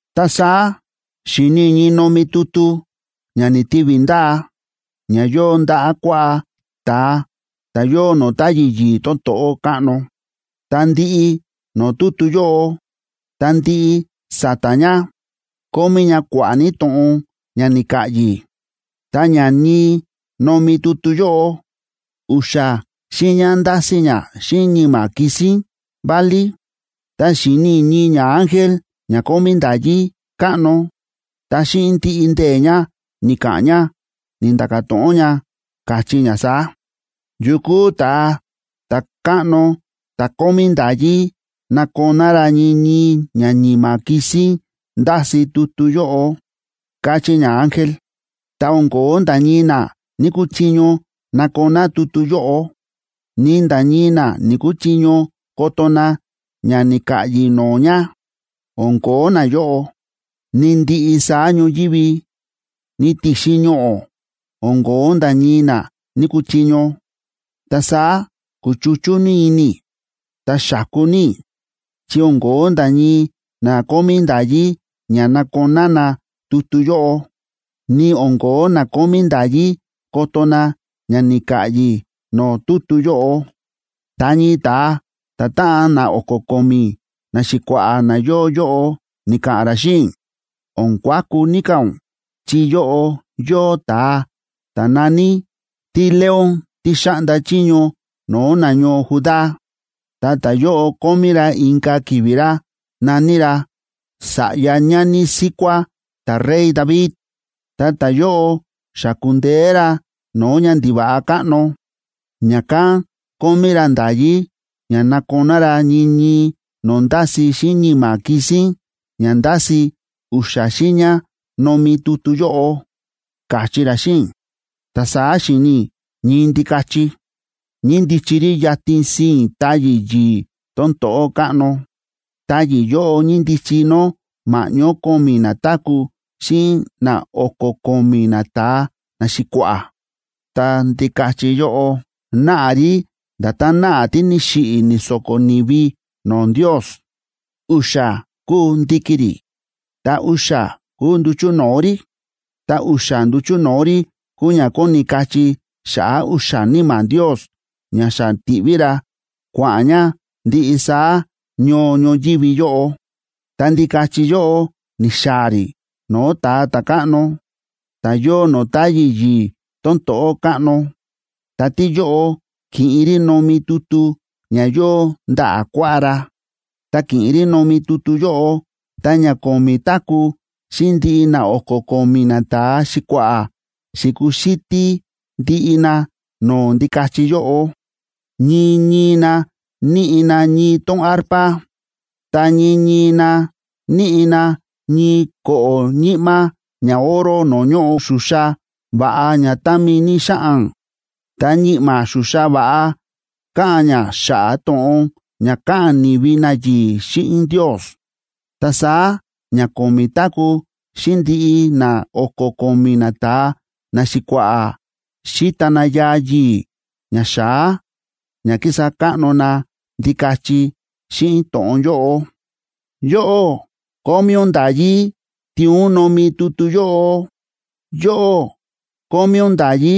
Ta saá xi̱ni i̱ ñii nomi tutu ña ni̱tivi ndaa, ña yóo ndaꞌa̱ kuaꞌá ta̱a ta̱ yóo no̱o̱ táyi̱ yi̱i̱ tón to̱ꞌó káꞌno. Ta ndiꞌi no̱o̱ tutu yóꞌo, ta ndiꞌi sa̱ta̱ ña, kómí ña kua̱ꞌa̱ ní to̱ꞌon ña ni̱ka̱ꞌyi̱. Ta ña ñii nomi tutu yóꞌo, u̱xa̱ xiiña ndási ña xíꞌin ñi̱ma̱ kisín válí. Ta xi̱ni i̱ ñii ñaángel ña kómí nda̱yí káꞌno, ta xíꞌin ndiꞌi ndee̱ ña ni̱ka̱ꞌa̱n ña, ni̱nda̱ka̱ to̱ꞌon ña, káchí ña saá: ―¿Yu kúu ta̱a ta̱káꞌno ta̱ kómí nda̱yí nakoná ra ñii ñii ña ñi̱ma̱ kisín ndási tutu yóꞌo? ―káchí ñaángel. Ta o̱n ko̱ó nda̱ ñii na ni̱‑kuchiño nakoná tutu yóꞌo, ni nda̱ ñii na ni̱‑kuchiño koto na ña ni̱ka̱ꞌyi̱ no̱o̱ ña. O̱n ko̱ó nayóꞌo, ni ndiꞌi saá ñoyívi, ni ti̱xin ñoꞌo̱, o̱n ko̱ó nda̱ ñii na ni̱‑kuchiño. Ta saá ku̱chuchú ní ini i̱, ta xa̱ku ní i̱, chi o̱n ko̱ó nda̱ ñii na kómí nda̱yí ña nakoná na tutu yóꞌo, ni o̱n ko̱ó na kómí nda̱yí koto na ña ni̱ka̱ꞌyi̱ no̱o̱ tutu yóꞌo. Ta ñii ta̱a ta̱táꞌan na o̱ko̱ ko̱mi̱ naxi̱kua̱ꞌa̱ na yóo yóꞌo ni̱ka̱ꞌa̱n ra xíꞌin i̱: ―O̱n kuaku ní ka̱ ún chi yóꞌo yóo ta̱a ta̱ na̱ní “TíLeón tí xáꞌnda chiño no̱o̱ nañoo Judá”, ta ta̱yóꞌo kómí ra inka̱ ki̱vi̱ ra na̱ní ra “Sa̱ꞌya ñani síkuá ta̱rey David.”a Ta ta̱yóꞌo xa ku̱ndeé ra no̱o̱ ñandiva̱ꞌa káꞌno, ña̱kán kómí ra nda̱yí ña nakoná ra ñii ñii no̱o̱ ndási xíꞌin ñi̱ma̱ kisín ña ndási u̱xa̱ xiiña nomi tutu yóꞌo ―káchí ra xíꞌin i̱. Ta saá xi̱ni̱ i̱ ñii Ndikachi,b ñíndichi rí yatin sii̱n táyi̱ yi̱i̱ tón to̱ꞌó káꞌno. Táyi̱ yóꞌo ñíndichi nó ma̱ꞌñó ko̱mi̱ ñatáku̱ xíꞌin na o̱ko̱ ko̱mi̱ nata̱a naxi̱kua̱ꞌa̱. Ta Ndikachi yóꞌo náꞌa rí nda̱tán náꞌa tí ni̱xiꞌi̱ ni̱so̱ko̱ ni̱vi no̱o̱ Ndios. U̱xa̱ kúu ndi̱ki̱ rí, ta u̱xa̱ kúu nduchu̱ no̱o̱ rí. Ta u̱xa̱ nduchu̱ no̱o̱ rí kúu ña kóni kachí xa̱ꞌa̱ u̱xa̱ níma̱ Ndios ña xa ti̱ꞌví ra kua̱ꞌa̱n ña ndiꞌi saá ñoo ñoyívi yóꞌo. Ta Ndikachi yóꞌo ni̱xaa̱ rí no̱o̱ ta̱a ta̱káꞌno, ta̱ yóo no̱o̱ táyi̱ yi̱i̱ tón to̱ꞌó káꞌno, ta tíyóꞌo ki̱ꞌin rí nomi tutu ña yóo ndaꞌa̱ kuaꞌá ra. Tá ki̱ꞌin rí nomi tutu yóꞌo, ta ña ko̱mi̱ táku̱ xíꞌin ndiꞌi na o̱ko̱ ko̱mi̱ nata̱a xi̱kua̱ꞌa̱ xi̱kuxítí ndiꞌi na no̱o̱ Ndikachi yóꞌo. Ñii ñii na níꞌi na ñii tón arpa, ta ñii ñii na níꞌi na ñii ko̱ꞌo̱ ñi̱ꞌma̱ ñaoro no̱o̱ ñóꞌo xuxa va̱ꞌa ña támi ní xáꞌan. Ta ñi̱ꞌma̱ xuxa va̱ꞌa káꞌa̱n ña xa̱ꞌa̱ to̱ꞌon ña káꞌa̱n ni̱vi nayi̱i̱ xíꞌin Ndios. Ta saá ña ko̱mi̱ táku̱ xíꞌin ndiꞌi na o̱ko̱ ko̱mi̱ nata̱a naxi̱kua̱ꞌa̱ xi̱ta na yaa yi̱i̱ ña xa̱á ña kísa káꞌno na Ndikachi xíꞌin to̱ꞌon yóꞌo: Yóꞌó kómí ún nda̱yí tiin ún nomi tutu yóꞌo. Yóꞌó kómí ún nda̱yí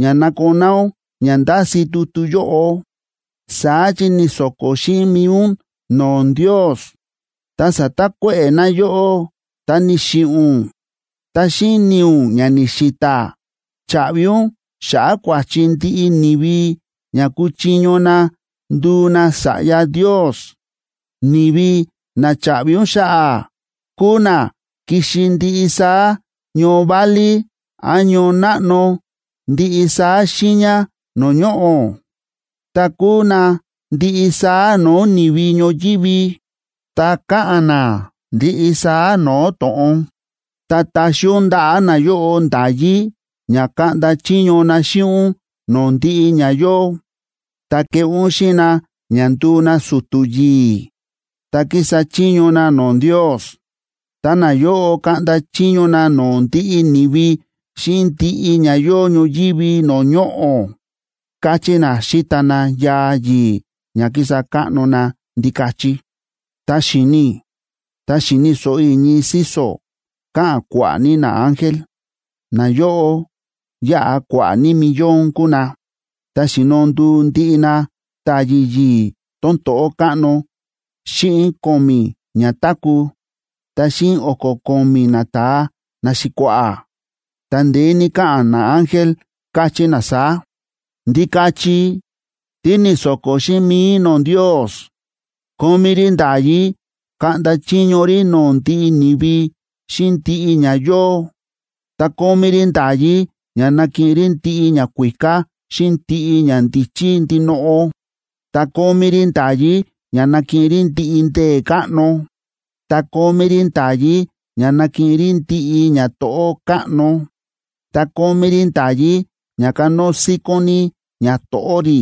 ña nakoná ún ña ndási tutu yóꞌo. Sáa̱ chi ni̱so̱ko̱ xíꞌin mi̱i ún no̱o̱ Ndios, ta sa̱takuéꞌe̱ na yóꞌó, ta ni̱xiꞌi̱ ún. Ta xíꞌin ni̱i̱ ún ña ni̱xi̱ta̱, cha̱ꞌvi ún xa̱ꞌa̱ kua̱chi ndiꞌi ni̱vi, ña kuchiño na nduu na sa̱ꞌya Ndios. Ni̱vi na cha̱ꞌvi ún xa̱ꞌa̱, kúu na ki̱xi ndiꞌi saá ñoo válí án ñoo náꞌno ndiꞌi saá xiiña no̱o̱ ñoꞌo̱. Ta kúu na ndiꞌi saá no̱o̱ ni̱vi ñoyívi, ta káꞌa̱n na ndiꞌi saá no̱o̱ to̱ꞌon. Ta ta̱xi ún ndaꞌa̱ nayóꞌo nda̱yí ña kaꞌnda chiño na xíꞌin ún no̱o̱ ndiꞌi ña yóo, ta ke̱ꞌé ún xíꞌin na ña ndu̱u na su̱tu̱ yi̱i̱, ta kísa chiño na no̱o̱ Ndios. Ta nayóꞌo kaꞌnda chiño na no̱o̱ ndiꞌi ni̱vi xíꞌin ndiꞌi ña yóo ñoyívi no̱o̱ ñoꞌo̱, káchí na xíta na yaa yi̱i̱ ña kísa káꞌno na Ndikachi. Ta xi̱ni i̱, ta xi̱ni̱ so̱ꞌo i̱ ñii síso̱ káꞌa̱n kua̱ꞌa̱ ní naángel, nayóꞌo yáꞌa kua̱ꞌa̱ ní millón kúu na. Ta xi̱no nduu ndiꞌi na táyi̱ yi̱i̱ tón to̱ꞌó káꞌno xíꞌin ko̱mi̱ ñatáku̱, ta xíꞌin o̱ko̱ ko̱mi̱ nata̱a naxi̱kua̱ꞌa̱, ta ndeé ní káꞌa̱n naángel, káchí na saá: Ndikachi tí ni̱so̱ko̱ xíꞌin mi̱i no̱o̱ Ndios kómí rí nda̱yí kaꞌnda chiño rí no̱o̱ ndiꞌi ni̱vi xíꞌin ndiꞌi ña yóo, ta kómí rí nda̱yí ña nakiꞌin rí ndiꞌi ñakuíká xíꞌin ndiꞌi ñandíchí ndinoꞌo, ta kómí rí nda̱yí ña nakiꞌin rí ndiꞌi ndee̱ káꞌno, ta kómí rí nda̱yí ña nakiꞌin rí ndiꞌi ñato̱ꞌó káꞌno, ta kómí rí nda̱yí ña kánóo síkón ní ñato̱ꞌó rí,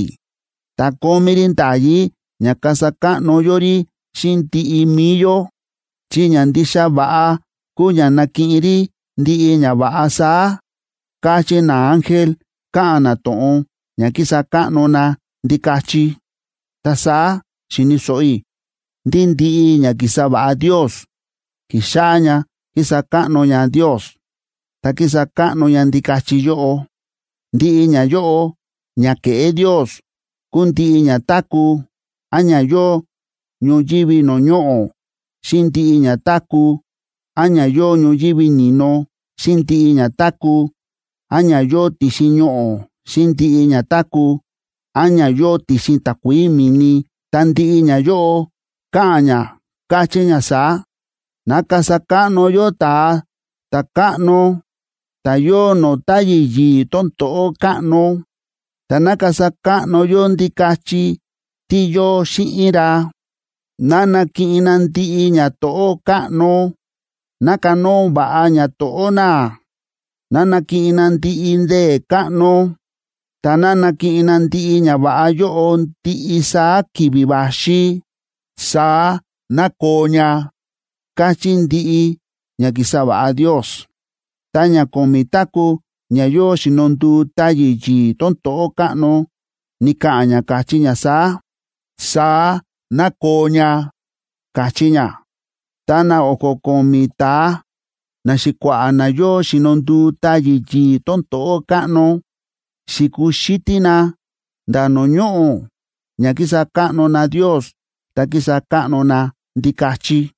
ta kómí rí nda̱yí ña kasa káꞌno yó rí xíꞌin ndiꞌi mi̱i yó, chi ña ndixa va̱ꞌa kúu ña nakiꞌin rí ndiꞌi ñava̱ꞌa saá, káchí naángel, káꞌa̱n na to̱ꞌon ña kísa káꞌno na Ndikachi. Ta saá xi̱ni̱ so̱ꞌo i̱ ndí ndiꞌi ña ki̱sa va̱ꞌa Ndios ki̱xáꞌá ña kísa káꞌno ña Ndios, ta kísa káꞌno ña Ndikachi yóꞌo. Ndiꞌi ñayóꞌo ña ke̱ꞌé Ndios kúu ndiꞌi ña táku̱ án ña yóo ñoyívi no̱o̱ ñoꞌo̱, xíꞌin ndiꞌi ña táku̱ án ña yóo ñoyívi ni̱no, xíꞌin ndiꞌi ña táku̱ án ña yóo ti̱xin ñoꞌo̱, xíꞌin ndiꞌi ña táku̱ án ña yóo ti̱xin takuií mi̱ni, ta ndiꞌi ñayóꞌo káꞌa̱n ña, káchí ña saá: Ná kasa káꞌno yó ta̱a ta̱káꞌno ta̱ yóo no̱o̱ táyi̱ yi̱i̱ tón to̱ꞌó káꞌno, ta ná kasa káꞌno yó Ndikachi tí yóo xíꞌin ra. Ná nakiꞌin na ndiꞌi ñato̱ꞌó káꞌno. Ná kanóo va̱ꞌa ñato̱ꞌó na. Ná nakiꞌin na ndiꞌi ndee̱ káꞌno, ta ná nakiꞌin na ndiꞌi ñava̱ꞌa yóꞌo ndiꞌi saá ki̱vi̱ va̱xi. Saá ná koo ña, káchí ndiꞌi ña ki̱sa va̱ꞌa Ndios. Ta ña ko̱mi̱ táku̱ ña yóo xi̱no nduu táyi̱ yi̱i̱ tón to̱ꞌó káꞌno ni̱ka̱ꞌa̱n ña, káchí ña saá: ―Saá ná koo ña ―káchí ña. Ta na o̱ko̱ ko̱mi̱ ta̱a naxi̱kua̱ꞌa̱ na yóo xi̱no nduu táyi̱ yi̱i̱ tón to̱ꞌó káꞌno, xi̱kuxítí na nda̱ no̱o̱ ñoꞌo̱, ña ki̱sa káꞌno na Ndios, ta ki̱sa káꞌno na Ndikachi.